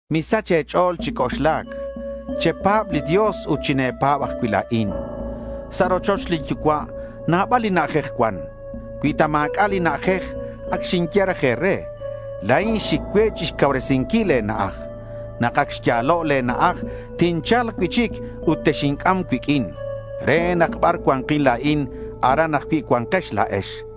Misach e̱ch'o̱l chi c'oxlac. Chepa̱b li Dios ut chine̱pa̱b ajcui' la̱in. Sa' rochoch lin Yucua' nabal li na'ajej cuan. Cui ta ma̱c'a' li na'ajej, ac xinye raj e̱re. La̱in xic cue chixcauresinquil e̱na'aj. Nak ac xya̱lo' le̱ na'aj, tincha̱lk cui'chic ut texinc'am cuiq'uin re nak bar cua̱nkin la̱in, aran ajcui' cua̱nkex la̱ex.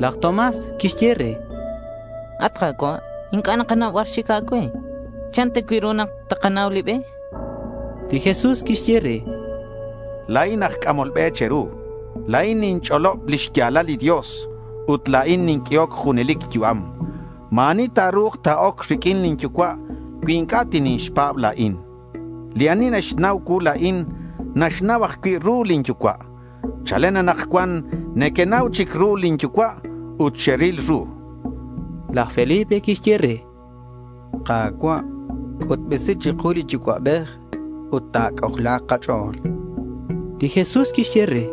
Laj Tomás quixye re: —At Ka̱cua', inc'a' nakanau bar xic a̱cue. ¿Chan ta cui' ru nak takanau li be? chan. Li Jesús quixye re: —La̱in aj c'amol be che̱ru. La̱in ninch'olob li xya̱lal li Dios ut la̱in ninq'uehoc junelic yu'am. Ma̱ ani ta̱ru̱k ta̱oc riq'uin lin Yucua' cui inc'a' tinixpa̱b la̱in. Li ani naxnau cuu la̱in naxnau ajcui' ru lin Yucua'. Chalen anakcuan nequenau chic ru lin Yucua' ut xeril ru, chan li Jesús. Laj Felipe quixye re: —Ka̱cua', c'utbesi chiku li Yucua'bej ut ta̱c'ojla̱k kach'o̱l, chan. Li Jesús quixye re: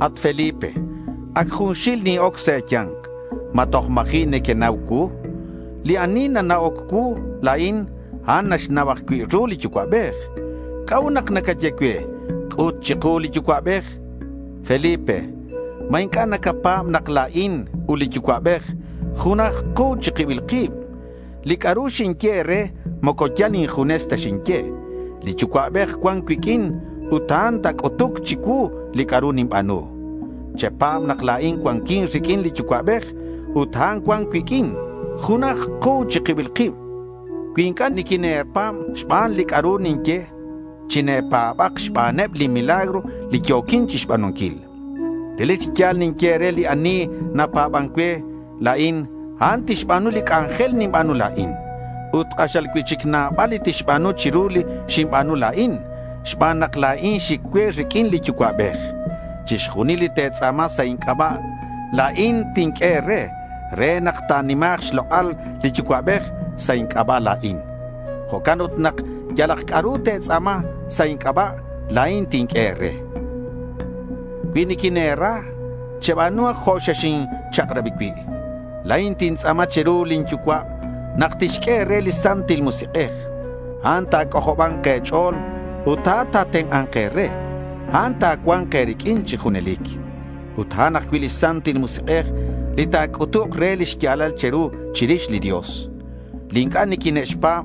—At Felipe, ac junxil nin-oc sa' e̱ya̱nk. ¿Ma toj ma̱ji' nequenau cuu? Li ani nana'oc cuu la̱in, a'an naxnau ajcui' ru li Yucua'bej. ¿C'a'ut nak nacaye cue, “C'ut chiku li Yucua'bej?” Felipe, ¿ma inc'a' nacapa̱b nak la̱in ut li Yucua'bej junaj ku chi kibil kib? Li c'a'ru xinye e̱re moco yal injunes ta xinye. Li Yucua'bej cuan cuiq'uin, ut a'an nac'utuc chicuu li c'a'ru ninba̱nu. Chepa̱b nak la̱in cuanquin riq'uin li Yucua'bej ut a'an cuan cuiq'uin. Junaj ku chi kibil kib. Cui inc'a' niquine̱pa̱b xban li c'a'ru ninye, chine̱pa̱bak xbaneb li milagro li yo̱quin chixba̱nunquil. Relic chi ya̱l ninye e̱re, li ani napa̱ban cue la̱in, a'an tixba̱nu li c'anjel ninba̱nu la̱in. Ut k'axal cui'chic nabal li tixba̱nu chiru li xinba̱nu la̱in xban nak la̱in xic cue riq'uin li Yucua'bej. Chixjunil li te̱tz'a̱ma sa' inc'aba', la̱in tinq'ue e̱re re nak ta̱nima̱k xlok'al li Yucua'bej sa' inc'aba' la̱in. Jo'can ut nak yalak c'a'ru te̱tz'a̱ma sa' inc'aba', la̱in tinq'ue e̱re. Cui niquine̱ra, cheba̱nuhak jo' xexinchak'rabi cui'. La̱in tintz'a̱ma chiru lin Yucua' nak tixq'ue e̱re li Santil Musik'ej. A'an ta̱c'ojoba̱nk e̱ch'o̱l ut a'an ta̱tenk'a̱nk e̱re. A'an ta̱cua̱nk e̱riq'uin chi junelic. Ut a'an ajcui' li Santil Musik'ej li ta̱c'utuk re li xya̱lal che̱ru chirix li Dios. Li inc'a' niquine'xpa̱b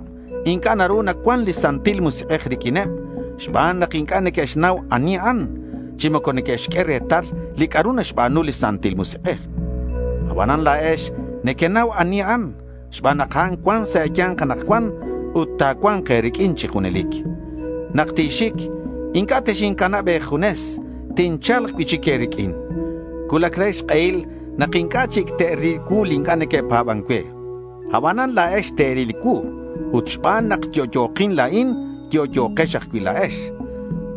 inc'a' naru nacuan li Santil Musik'ej riq'uineb xban nak inc'a' neque'xnau ani a'an, chi moco neque'xq'ue retal li c'a'ru naxba̱nu li Santil Musik'ej. Abanan la̱ex nequenau ani a'an xban nak a'an cuan sa' e̱ya̱nk anakcuan ut ta̱cua̱nk e̱riq'uin chi junelic. Nak tinxic inc'a' texincanab e̱junes. Tincha̱lk cui'chic e̱riq'uin. Cuulac re xk'ehil nak inc'a' chic te'ril cuu li inc'a' neque'pa̱ban cue. Abanan la̱ex te̱ril cuu. Ut xban nak yo'yo̱kin la̱in, yo'yo̱kex ajcui' la̱ex.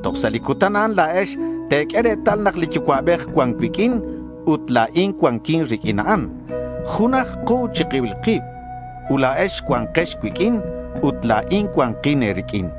Toj sa' li cutan a'an la̱ex te̱q'ue retal nak li Yucua'bej cuan cuiq'uin ut la̱in cuanquin riq'uin a'an. Junaj ku chi kibil kib. Ut la̱ex cua̱nkex cuiq'uin ut la̱in cua̱nkin e̱riq'uin.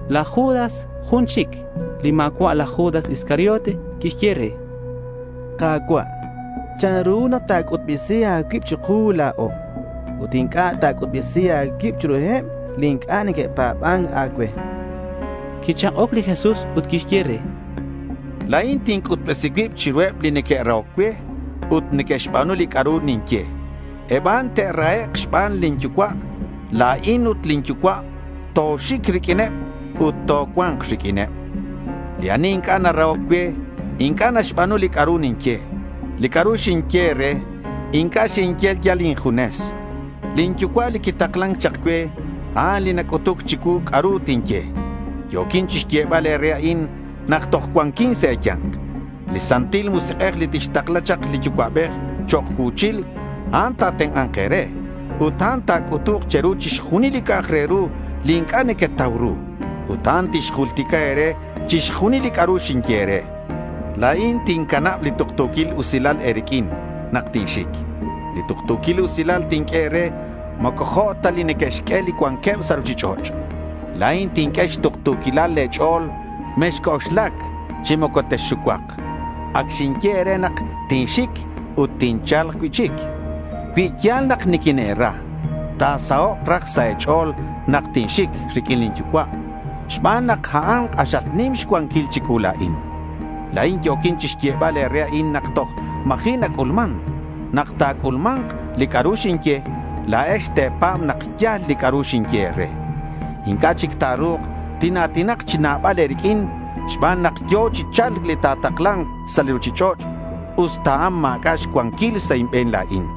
Laj Judas jun chic, li ma̱cua' laj Judas Iscariote, quixye re: —Ka̱cua', ¿chanru nak ta̱c'utbesi a̱cuib chiku la̱o, ut inc'a' ta̱c'utbesi a̱cuib chiruheb li inc'a' neque'pa̱ban a̱cue? chan. Quichak'oc li Jesús ut quixye re: —La̱in tinc'utbesi cuib chiruheb li neque'rahoc cue ut neque'xba̱nu li c'a'ru ninye. Eb a'an te'rahek' xban lin Yucua'. La̱in ut lin Yucua' toxic riq'uineb ut tocua̱nk riq'uineb. Li ani inc'a' narahoc cue inc'a' naxba̱nu li c'a'ru ninye. Li c'a'ru xinye e̱re, inc'a' xinye yal injunes. Lin Yucua' li quitaklan chak cue, a'an li nac'utuc chicuu c'a'ru tinye. Yo̱quin chixyebal e̱re a'in nak toj cuanquin sa' e̱ya̱nk. Li Santil Musik'ej li tixtakla chak li Yucua'bej chok' cuu̱chil, a'an ta̱tenk'a̱nk e̱re ut a'an ta̱c'utuk che̱ru chixjunil li c'a'ak re ru li inc'a' nequetau ru. Ut a'an tixjultica e̱re chixjunil li c'a'ru xinye e̱re. La̱in tincanab li tuktu̱quil usilal e̱riq'uin nak tinxic. Li tuktu̱quil usilal li tinq'ue e̱re moco jo' ta li neque'xq'ue li cuanqueb sa' ruchich'och'. La̱in tinq'ue xtuktu̱quilal le̱ ch'o̱l. Mexc'oxlac chi moco texxucuak. Ac xinye e̱re nak tinxic, ut tincha̱lk cui'chic. Cui ya̱l nak niquine̱ra, ta̱sahok' raj sa' e̱ch'o̱l nak tinxic riq'uin lin Yucua', xban nak a'an k'axal nim xcuanquil chicuu la̱in. La̱in yo̱quin chixyebal e̱re a'in nak toj ma̱ji' nac'ulman. Nak ta̱c'ulma̱nk li c'a'ru xinye, la̱ex te̱pa̱b nak ya̱l li c'a'ru xinye e̱re. Inc'a' chic ta̱ru̱k tina̱tinak chi nabal e̱riq'uin xban nak yo̱ chi cha̱lc li nataklan sa' li ruchich'och', usta a'an ma̱c'a' xcuanquil sa' inbe̱n la̱in.